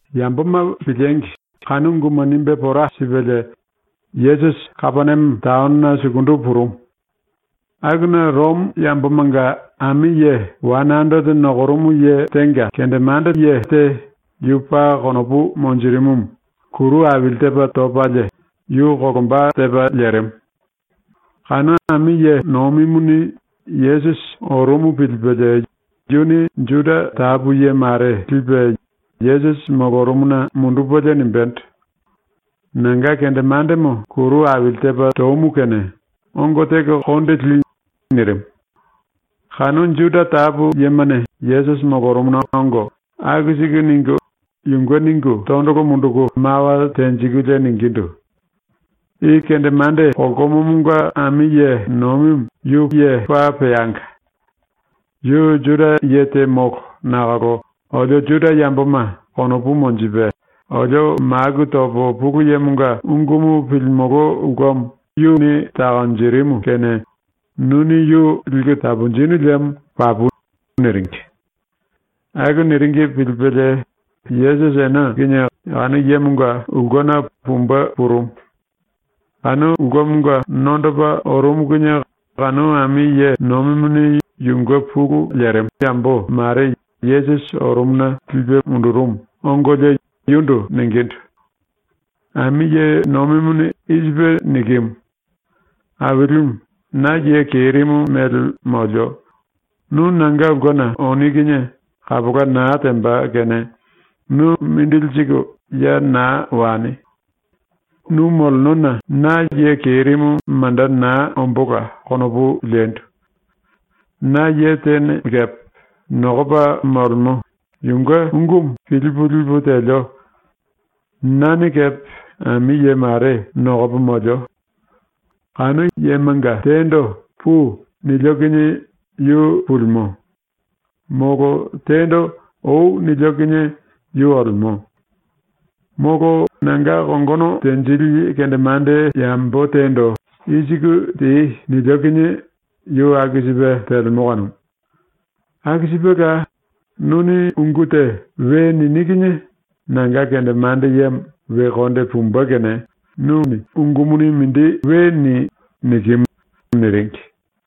Yamboma piliengi kanu unguma nimbe pora sipelie Yesusi Kapeniame taonona sukundu purumu. Akuna Romo yambomanga ami ye wane anderete nokorumu ye tenga kendemande te yu paa konopu monjirimumu kuru aili tepa topalie yu kolomba tepa lerimu. Kanu ami ye nomimuni Yesusi orumu pilipelie yuni Juda tapu ye mare lipe Yesusi molorumuna mundupelie nimbendo: “Nanga kendemandemo ⸤kuru aili tepa tomu kene⸥ ongo teko konde li.” nirimu. Kanu Juda tapu yemane Yesusi molorumuna ongo aku siku ningu, yunge ningu tondolo munduku mawa tenjikulie ningindu: “I kendemande kolkomomonga ami ye nomimu yu paa peanga. ⸤Yu Juda ye te molo⸥ nakolo olio Juda yamboma konopu monjipe, olio maku topo Pulu Yemonga ungumu pilimolo ulkemo yuni takonjirimu kene nuni yu liku taponjinu liemo papu.” niringi. Aku niringi pilipelie Yesusi ene kinie kanu yemonga ulkena pumbe purumu. Kanu ulkemonga nondopa orumu kinie kanu ami ye nomimuni yunge pulu lemo yambo mare Yesusi orumuna lipe mundurumu ongolie yundu ningindu: “Ami ye nomimuni i sipe nikimu: “Ailimu, na ye kerimu mele molio, nu nanga ulkena oni kinie kapola naa temba kene nu mindili siku ya naa wani. Nu molenona na ye kerimu manda naa ombóla konopu lendu. Na ye tene kepe nokopa molemo, yunge ungumu pilipu lipu telio. Nane kepe ami ye mare nokopo molio. Kanu yemanga tendo “Pui.” nilio kinie yu pulimo. Molo tendo “Oi.” nilio kinie yu olemo. Molo nanga kongono tenjili kendemande yambo tendo “I siku tei.” nilio kinie yu aku sipe telemo kanumu. Aku sipela, nuni ungu te we nini kinie nanga kendemande ⸤yemo⸥ we konde pumbe kene nu we ni.” nikimu.” niringi.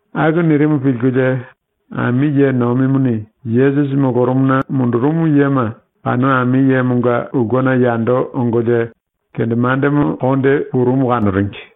Aku nirimu pilkulie ami ye nomimuni Yesusi molorumuna mundurumu yema kanu ami yemonga ulkena yando ongolie kendemandemo konde purumu kanoringi.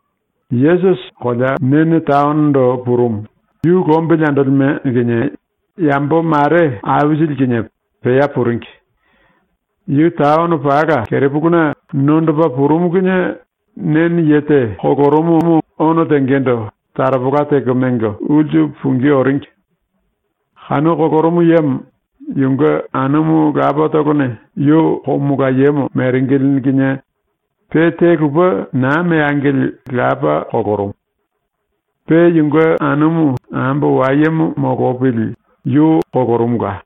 Yesusi Nene taonondo purumu, yu lombili andolime kinie yambo mare aisili kinie pea puringi. Yu taono pala kerepuluna nondopa purumu kinie Nene ye te kolorumumu ono tengendo taropola teko mengo ulsu pungí oringi. Kanu kolorumu yemo yunge anumu lapatolone yu komolayemo meringili kinie pe te lupe naa meangili lapa kolorumu. Pe yunge anumu ambo wayemo molopili yu kolorumula.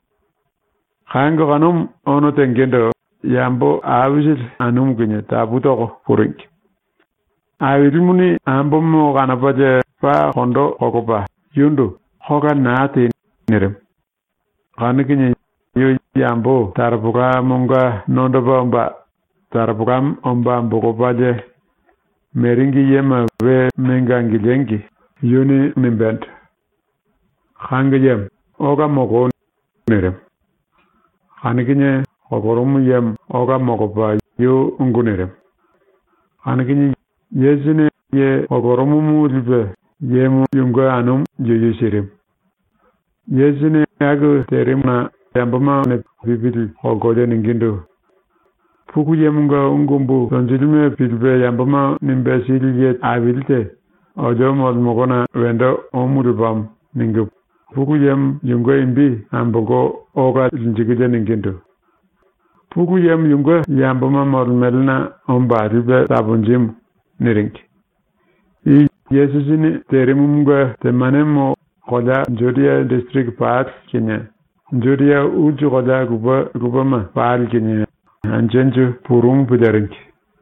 Kango kanumu ono tengendo yambo aisili anumu kinie tapu toko puringi. Ailimuni ambomo kanopalie paa kondo kolopa yundu “Kola naa tei.” nirimu. Kanu kinie yu yambo taropolamonga nondopa omba taropolamo omba ambolopalie, meringi yema we mengo angiliengi yuni nimbendo: “Kango yemo, ola moloi.” nirimu. Kanu kinie kolorumu yemo ola molopa yu ungu nirimu. Kanu kinie Yesusini ye kolorumumu lipe yemo yunge anumu yuyu sirimu. Yesusini aku terimuna yambomane pipili kolkolie ningindu: “Pulu Yemonga ungu umbu tonjilime pilipe yamboma nimbe sili ye aili te olio molemolona wendo omu lepamo.” ningu Pulu Yemo yunge imbi ambolko ola linjikulie ningindu: “Pulu Yemo yunge yamboma molemelena omba lipe taponjimu.” niringi. I Yesusini terimumunge temanemo kolea Judia disiriki pali kinie Judia ulsu kolea lupe lupema pali kinie anju anju purumu piliringi.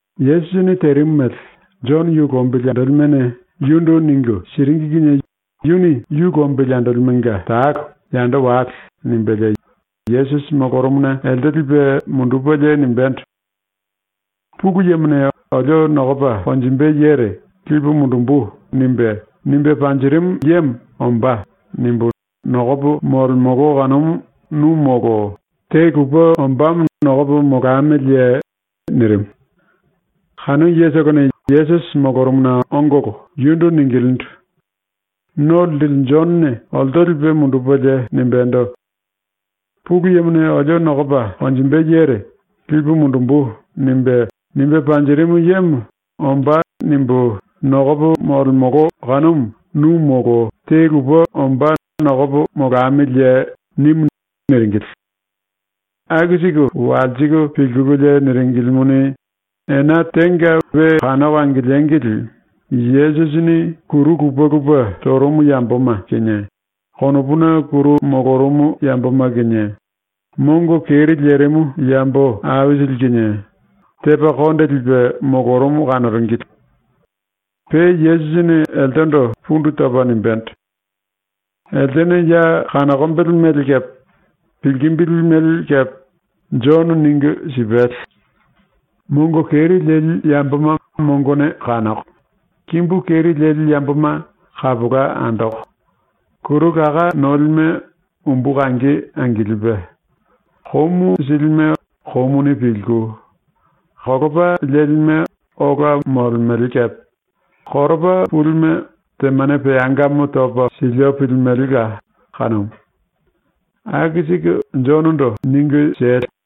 Yesusini terimu mele Jono yu lombili andolimene yundu ningu siringi kinie yuni yu lombili andolimenga talo “Yando wale.” nimbelie Yesusi molorumuna elte lipe mundupelie nimbendo: “⸤Pulu Yemone olio nokopa konjimbe yere⸥ “Lipu mundumbu.” nimbe, nimbe panjirimu yemo ‘Ombá.’ nimbu nokopo molemolo kanumu nu molo te lupe ombámo nokopo molamiliye?” nirimu. Kanu yetolone Yesusi molorumuna ongolo yundu ningilindu: “No Linjili Jonone olto lipe mundupelie nimbendo: “⸤Pulu Yemone olio nokopa konjimbe yere⸥ “Lipu mundumbu.” nimbe, nimbe panjirimu yemo ‘Ombá.’ nimbu nokopo molemolo kanumu nu molo te lupe ombá nokopo molamiliye?” nimu.” niringili. Aku siku walsiku pilkululie niringilimuni, ena tenga ⸤we kanoko angiliengili⸥ Yesusini kuru lupe lupe torumu yamboma kinie, konopuna kuru molorumu yamboma kinie, mongo keri lerimu yambo aisili kinie, tepa konde lipe molorumu kanoringili. Pe Yesusini eltendo pundu topa nimbendo: “Eltene ya kanokombele mele kepe pilkimbili mele kepe Jono ningu sipale. Mongo keri leli yamboma mongone kanoko, kimbu keri leli yamboma kapola andoko, kuru laká nolime umbu kangi angilipe, komu silime komuni pilku, kolopa lelime ola molemele kepe, koropa pulime temane peangamo topo silio pilimelela kanumu. Aku siku Jonondo ningu siele.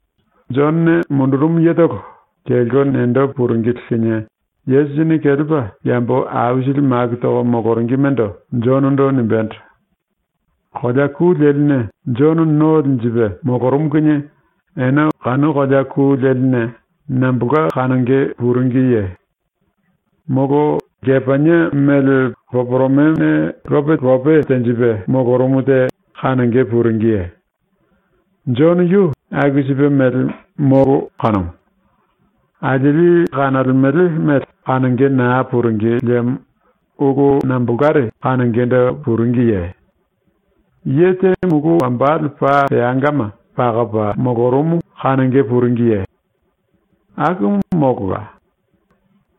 Jonone mundurumu yetolo kelko nendo puringili kinie Yesusini kelepa yambo aisili maku toko moloringimendo Jonondo nimbendo: “⸤Kolea ku leline Jono no linjipe molorumu kinie⸥ ene kanu kolea ku leline nambolka kanonge puringiye? ⸤Molo⸥ lkepanie mele poporomene lope lope tenjipe molorumu te kanonge puringiye? ⸤Jono yu aku sipe mele molo kanumu.⸥ ⸤Alieli kanolemele mele kanonge naa puringi liemo⸥ ulu nambolkare kanongendo puringiye? Ye te mulu wambale paa peangama pakopa molorumu kanonge puringiye? Akumu molola.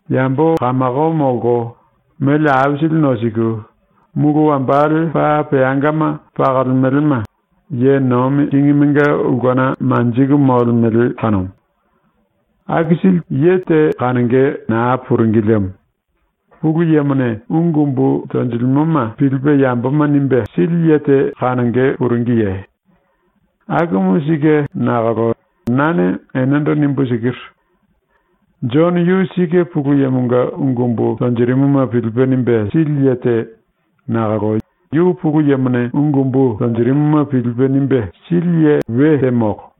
Yambo kamako molko, mele aisili nosiku, mulu wambale paa peangama pakolemelema ye nomi kingimenga ulkena manjiku molemele kanumu. “⸤Aku sili te kanonge naa puringi liemo⸥ Pulu Yemone ungu umbu tonjilimoma pilipe yamboma nimbe sili ye te kanonge puringiye? Akumu sike nakolo nane enendo nimbu sikiru. Jono yu sike Pulu Yemonga ungu umbu tonjirimuma pilipe nimbe sili ye te nakolo yu Pulu Yemone ungu umbu tonjirimuma pilipe nimbe sili ye we te molo.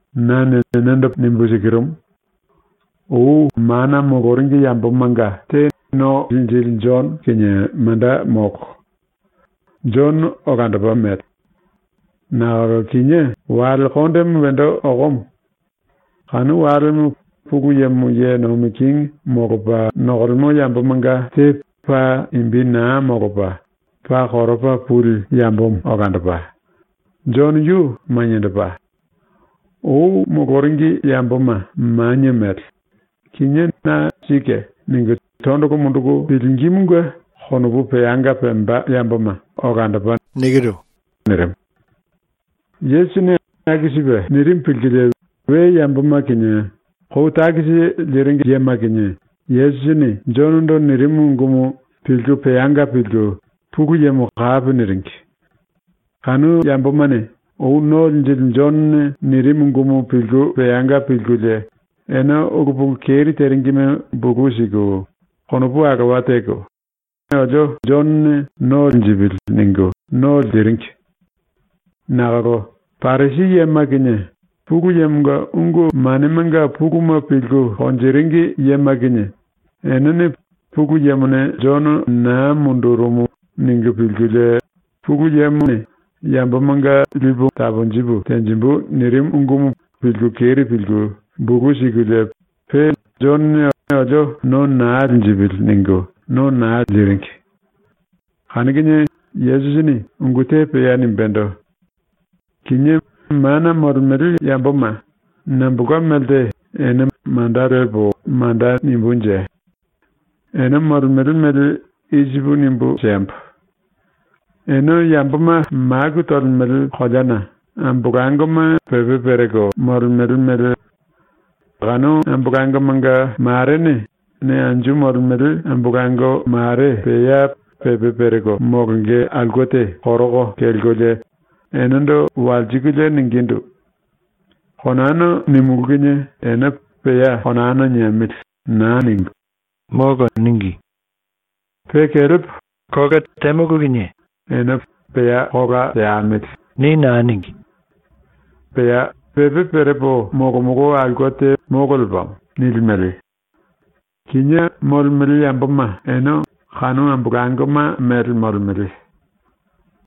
Nane enendo paa sike nimbu sikirumu: Ou mana moloringi yambomanga te ⸤No Linjili⸥ Jono kinie manda molo. Jono olandopa mele. Nakolo kinié wale kondemo wendo okomo. Kanu walemo Pulu Yemo ye nomi kingi molopa nokolemo yambomanga te paa imbi naa molopa paa koropa puli yambomo olandopa; Jono yu maniendopa. ⸤Ou moloringi yamboma manie mele; kinié na ‘Sike.’ ningu tondolo munduku pilingímunge konopu peanga pemba yamboma olandopa.⸥” nirimu. Yesusini aku sipe nirimu pilkulie we yamboma kinie kou takisi liringi yema kinie Yesusini Jonondo nirimu ungumu pilku peanga pilku Pulu Yemo kapi niringi. Kanu yambomane ou ⸤No Linjili⸥ Jonone nirimu ungumu pilku peanga pilkulie ene ulu pulu keri teringime bulu siku, konopu alowa teko ‘Olio Jonone no linjipili.’ ningu no liringi. Nakolo Parisi yema kinie, Pulu Yemonga ungu manemanga puluma pilku konjiringi yema kinie, enene ‘Pulu Yemone Jono naa mundurumu.’ ningu pilkulie, Pulu Yemone “Yambomanga lipu taponjipu tenjimbu.” nirimu ungumu pilku keri pilku bulu sikulie pe ‘Jonone olio no naa linjipili.’ ningu no naa liringi. Kanu kinie Yesusini ungu te pea nimbendo: “Kinié mana molemele yamboma nambolka melte ene manda lepo manda nimbunje? ⸤Ene molemele mele i sipu nimbu siembo:⸥ Ene yamboma maku tolemele koleana ambolangoma pepe pereko molemele mele. Kanu ambolangomanga marene ne anju molemele ambolango mare ⸤pea pepe pereko molonge aulke te koroko kelkolie⸥ enendo walsikulie ningindu: “Konana nímulu kinie ene ‘Pea konana niemili.’ naa ningu “Molo.” níngi. Pe kelepo kola temulu kinie ene ‘Pea kola teamili.’ ni naa níngi. ⸤Pea pepe perepo molomolo aulke te molo lepamo.⸥” nilimele. ⸤Kinié molemele yamboma ene kanu ambolangoma mele molemele.⸥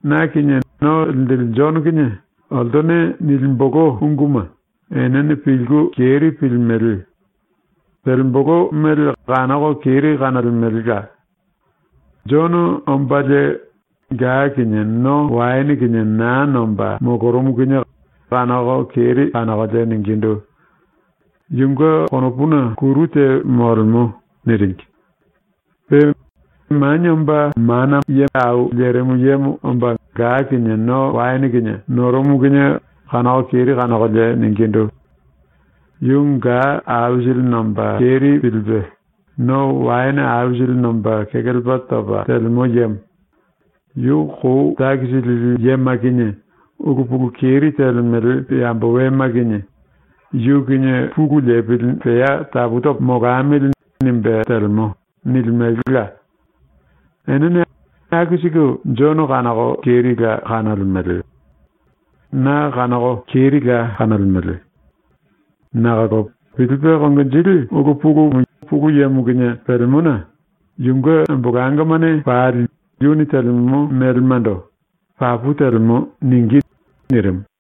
⸤Na kinie No Linjili Jono kinie oltone nilimbolo unguma enene pilku keri pilimele; telembolo mele kanoko keri kanolemelela⸥. Jono ombalie ga kinie no waene kinie naa nomba molorumu kinie ⸤kanoko keri kanokolie⸥ ningindu: “Yunge konopuna kuru te molemo.” niringi. Pe Manie Omba Mana Ye Au Lerimu Yemo omba ga kinie no waene kinie norumu kinie ⸤kanoko kerila kanokolie⸥ ningindu: “Yu ga aisili nomba keri pilipe, no waene aisili nomba kekelepa topa telemo yemo. Yu kou takisi lili yema kinie, ulu pulu keri telemele yambo wema kinie ‘Yu kinie pulu lepili pea tapu topo molamili.’ nimbe telemo.” nilimelela. ⸤Enene aku siku Jono kanoko kerila kanolemele. Na kanoko kerila kanolemele.⸥ Nakolo pilipe konginjili ulu pulumu Pulu Yemo kinie pelemona yunge ambolangomane pali yuni telemo melemando ‘Papu telemo.’ ningí.” nirimu.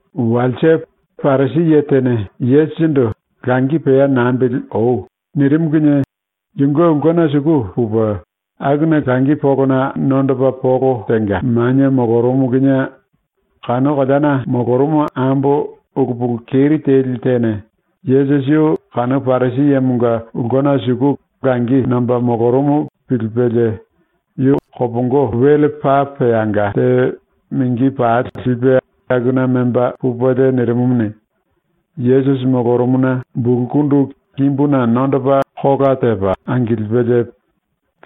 Walse, Parisi ye tene Yesusindu “Langi pea nambili oi.” nirimu kinie yunge ulkena suku pupe akuna langi polona nondopa polo tenga manie molorumu kinie kanu koleana molorumu ambo ulu pulu keri teli tene Yesusi yu kanu Parisi yemonga ulkena suku langi nomba molorumu pilipelie, yu kopongo wele paa peanga te mingi pali lipe akuna memba pupelie nirimumuni, Yesusi molorumuna bulkundu kimbuna nondopa kola tepa angilipelie,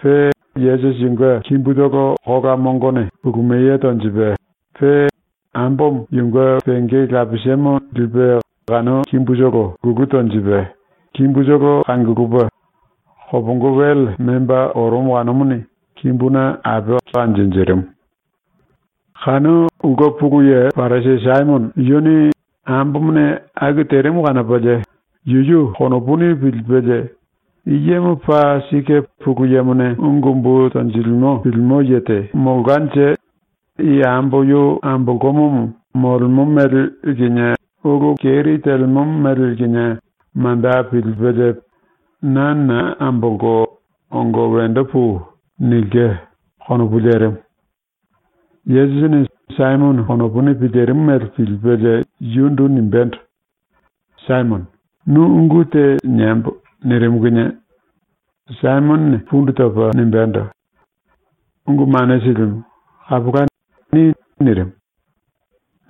pe Yesusi yunge kimbutolo kola mongone kulumiye tonjipe, pe ambomo yunge penge lapisemo lipe kanu kimbutolo kulu tonjipe, kimbutolo kangulupe, kopongo wele memba orumu kanumuni kimbuna ape kanjinjirimu. Kanu ulke pulu ye Parisi ⸤Saimono⸥ yuni ambomone aku terimu kanopalie yuyu konopuni pilipelie ‘I yemo paa sike Pulu Yemone ungu umbu tonjilimo pilimo ye te molkanje i ambo yu ambolkomomo molemo mele kinie ulu keri telemo mele kinie manda pilipelie “Na naa ambolko, ongo wendo pui.” nilke.’ konopu lerimu. Yesusini ⸤Saimono⸥ konopuni pilirimu mele pilipelie yundu nimbendo: “Saimono, nu ungu te niembo.” nirimu kinie Saimonone pundu topa nimbendo: “Ungu Mane Silimu, kapola, ni.” nirimu.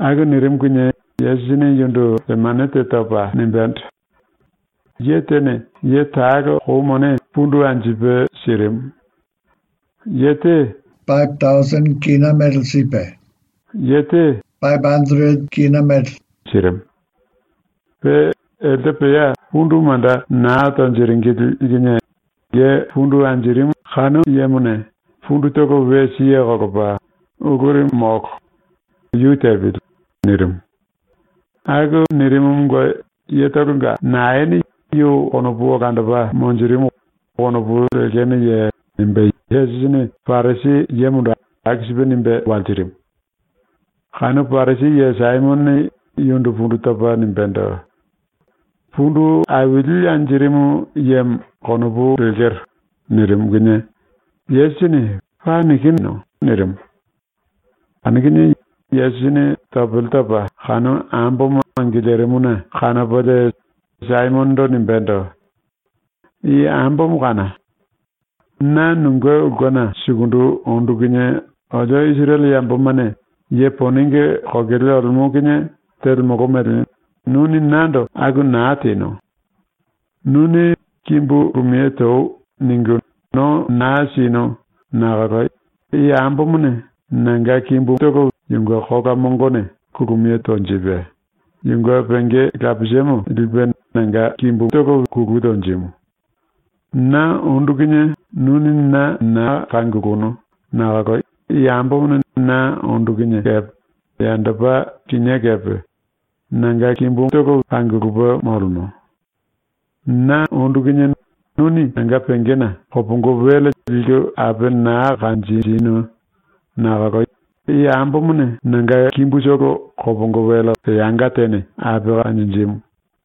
⸤Aku nirimu kinie Yesusini yundu temane te topa nimbendo:⸥ “Ye tene ye talo kou mone pundu anjipe sirimu. Ye te wane anderete kina mele sipe, ye te tene kina mele sirimu. Pe elte pea pundu manda naa tonjiringili kinie ye pundu anjirimu kanu yemone pundutolo we siye kolopa “Uluri molo, yu tepili.” nirimu. Aku nirimumunge yetolonga naene yu konopu olandopa monjirimu konopu lekenoye?” nimbe Yesusini Parisi yemondo aku nimbe walsirimu. ⸤Kanu Parisi ye⸥ Saimonone yundu pundu topa nimbendo: “Pundu aili anjirimu yemo, konopu lekero.” nirimu kinie Yesusini “Paa nikinu.” nirimu. Kanu kinie Yesusini topele topa kanu ambomo angilirimuna kanopalie Saimonondo nimbendo: “I ambomo kána! Na nunge ulkena sukundu ondu kinie ⸤olio Isirele yambomane ye ponenge kokele olemo kinie telemolo mele⸥ nuni nando aku naa tenu. Nuni “Kimbu kulumiye toi.” ningu no naa sinu nakolo i ambomone nanga kimbumu yunge kola mongone kulumiye tonjipe, yunge penge lapisemo lipe nanga kimbumu kulu tonjimu. Na ondu kinie nuni na naa kangulunu nakolo i ambomone na ondu kinie kepe yandopa kinié kepe nanga kimbumu kangulupe molemo. Na ondu kinie nuni nanga pengena kopongo wele liku ape naa kanjinu nakolo i ambomone nanga kimbutolo kopongo wele peanga tene ape kanjinjimu.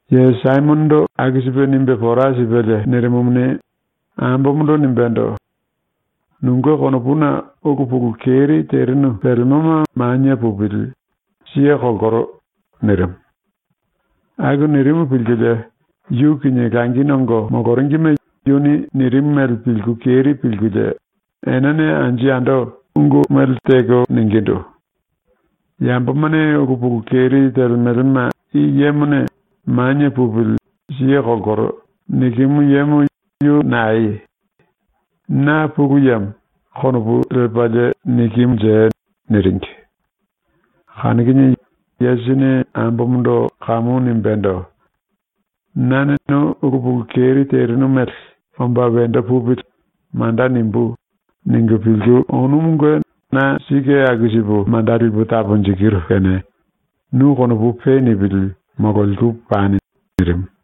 Ye Saimonondo aku sipe nimbe pora sipelie nirimumuni, ambomondo nimbendo: “Nunge konopuna ulu pulu keri terinu pelemoma manie pupili, siye kolkoro.” nirimu. Aku nirimu pilkulie yu kinie langi nongo moloringime yuni nirimu mele pilku keri pilkulie enene anju yando ungu mele teko ningindu: “Yambomane ulu pulu keri telemelema i yemone “Manie pupili, siye kolkoro.” nikimu yemo yu naeye? ⸤‘Na Pulu Yemo.’ konopu lepalie nikimunje?⸥” niringi. Kanu kinie Yesusini ambomondo kamu nimbendo: “Nane nu ulu pulu keri terinu mele ‘ ‘Omba wendo pupili.’ manda nimbú.’ ningu pilku onumunge na sike aku sipu manda lipu taponjikiru kene nu konopu pe nipili mololiku pani.” nirimu.